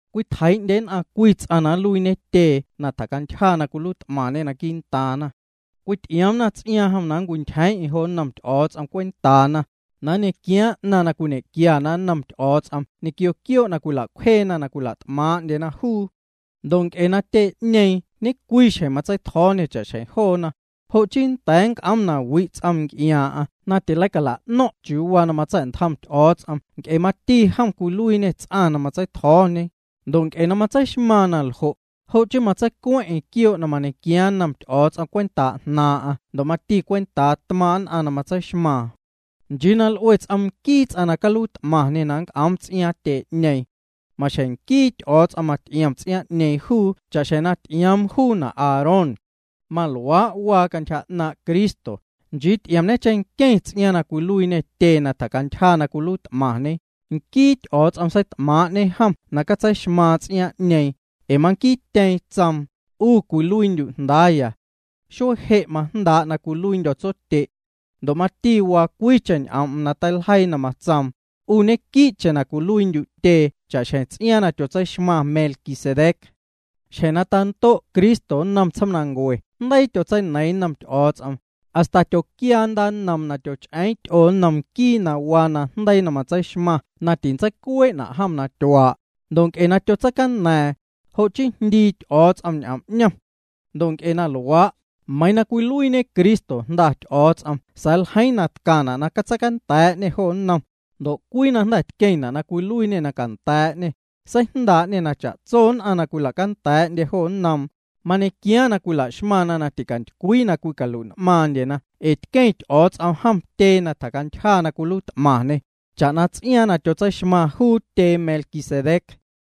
Cwitjeii'ndye nn'aⁿ cwii ts'aⁿ na nluiiñe tyee na tjacantyja cwiluiit'maⁿñe quii'ntaaⁿna. Cwity'iomna ts'iaaⁿ jom na meiⁿntyjeeⁿ'eⁿ jo nnom Ty'o̱o̱ts'om cwentaana, na nñequiaa tsaⁿ'ñeeⁿ 'naⁿ na cwiñequiana nnoom ñequio quioo' na cwila'cwjeena na cwila't'maaⁿ'ndyena jom. Ndo' nc'e juu tyee'ñeeⁿ ñecwiixjeⁿ matseitjo̱o̱ñe cha'xjeⁿ joona, jo' chii nnda̱a̱ nc'oom na wi' ts'oom nc'iaaⁿ'aⁿ na leicala'no̱ⁿ'na chiuu waa na matsa̱'ntjom Ty'o̱o̱ts'om nc'e mati jom cwiluiiñe ts'aⁿ na matseitjo̱o̱ñe, ndo' nc'e na matseixmaaⁿ na ljo', jo' chii matseicueⁿ'eⁿ quioo' na mañequiaaⁿ nnom Ty'o̱o̱ts'om cwentaa jnaaⁿ'aⁿ cha'xjeⁿ mati cwentaa nn'aⁿ tmaaⁿ' na matseixmaaⁿ. Meiⁿ tjaa 'ñeeⁿ juu na cwe' l'ue cheⁿnquii ts'om na caluiit'maⁿñe na nnc'oom ts'iaaⁿ tyee'ñeeⁿ. Maxjeⁿ nquii Ty'o̱o̱ts'om nnty'ioom ts'iaaⁿ'ñeeⁿ juu cha'xjeⁿ na ty'ioom juuna' Aarón. Maluaa' waa cantyja 'naaⁿ' Cristo, nchii ty'iomñe cheⁿnqueⁿ ts'iaaⁿ na cwiluiiñê tyee na tjacantyja, nquii Ty'o̱o̱ts'om seit'maaⁿ'ñe jom na catseixmaaⁿ ts'iaaⁿ'ñeeⁿ, ee manquiityeeⁿ tsoom: 'U cwiluiindyu' jndaaya. Xuee je' majndaa' na cwiluiindyo̱ tsotye'. Ndo' mati waa cwiicheⁿ ñ'oom'm na teiljeii na matsoom: 'U ñequii'cheⁿ na cwiluiindyu' tyee cha'xjeⁿ ts'iaaⁿ na tyotseixmaⁿ Melquisedec. Xjeⁿ na tando' Cristo nnom tsjomnancue jndeii tyotseineiiⁿ nnom Ty'o̱o̱ts'om, hasta tyoquiaa ndaannoom na tyoch'eeⁿ ty'oo nnom nquii na waa najndeii na matseixmaⁿ na tintseicuee'na' jom na tyuaa', ndo' nc'e na tyotseicaña̱a̱ⁿ, jo' chii jndii Ty'o̱o̱ts'om ñ'oom 'ñom. Ndo' nc'e na luaa', meiiⁿ na cwiluiiñe Cristo Jnda Ty'o̱o̱ts'om sa̱a̱ ljeiiⁿ na tcaⁿna' na catseicanda̱a̱'ñê jo nnom, ndo' cwii na jnda̱ tqueⁿna' na cwiluiiñê na canda̱a̱'ñê, seijndaa'ñena' na cha'tso nn'aⁿ na cwila'canda̱a̱'ndye joo nnoom, mañequiaaⁿ na la'xmaⁿna na ticantycwii na cwicalui'n'maaⁿndyena ee tqueⁿ Ty'o̱o̱ts'om jom tyee na tjacantyja na cwiluiit'maⁿñe, cha'na ts'iaaⁿ na tyotseixmaⁿ juu tyee Melquisedec.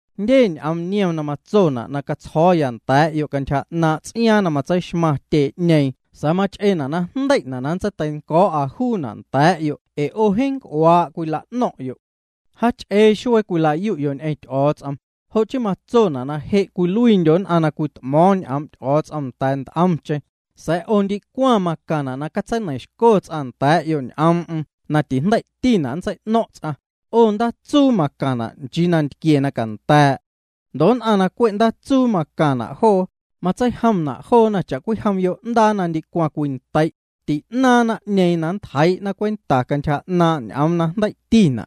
Jndye ñ'oom niom na matsona' na catsjo̱o̱ya nda̱a̱'yo' cantyja 'naaⁿ' ts'iaaⁿ na matseixmaⁿ tyee'ñeeⁿ sa̱a̱ mach'eena' na jndei'na' na nntseiteinco̱o̱'a juuna' nda̱a̱'yo' ee 'o jeeⁿ nc'uaa' cwila'no̱ⁿ'yo'. Jaach'ee xuee cwila'yu'yo' ñ'eⁿ Ty'o̱o̱ts'om, jo' chii matsona' na je' cwiluiindyo' nn'aⁿ na cwit'mo̱o̱ⁿ ñ'oom' Ty'o̱o̱ts'om nda̱a̱ nt'omcheⁿ, sa̱a̱ 'o ndicwaⁿ macaⁿna' na catseineiⁿxco ts'aⁿ nda̱a̱'yo' ñ'oom'm na tijndei'tina' na nntsei'no̱ⁿ' ts'aⁿ, 'o ndaatsuu macaⁿna' nchii nantquie na canda̱a̱'. Ndo' nn'aⁿ na cwe' ndaatsuu macaⁿna' joo, matseijomna' joona cha'cwijom yo'ndaa na ndicwaⁿ cwintei', ti'naaⁿ naⁿ'ñeeⁿ na ntjeii'na cwenta cantyja 'naaⁿ' ñ'oom na jndei'tina'.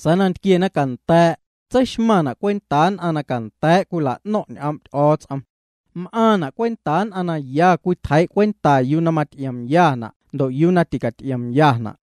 Sa̱a̱ nantquie na canda̱a̱', tseixmaⁿ juuna' cwentaa nn'aⁿ na canda̱a̱' cwila'no̱ⁿ' ñ'oom' Ty'o̱o̱ts'om. M'aaⁿna' cwentaa nn'aⁿ na ya cwitjeii' cwenta yuu na maty'iomyana' ndo' yuu na ticat'iomyana'.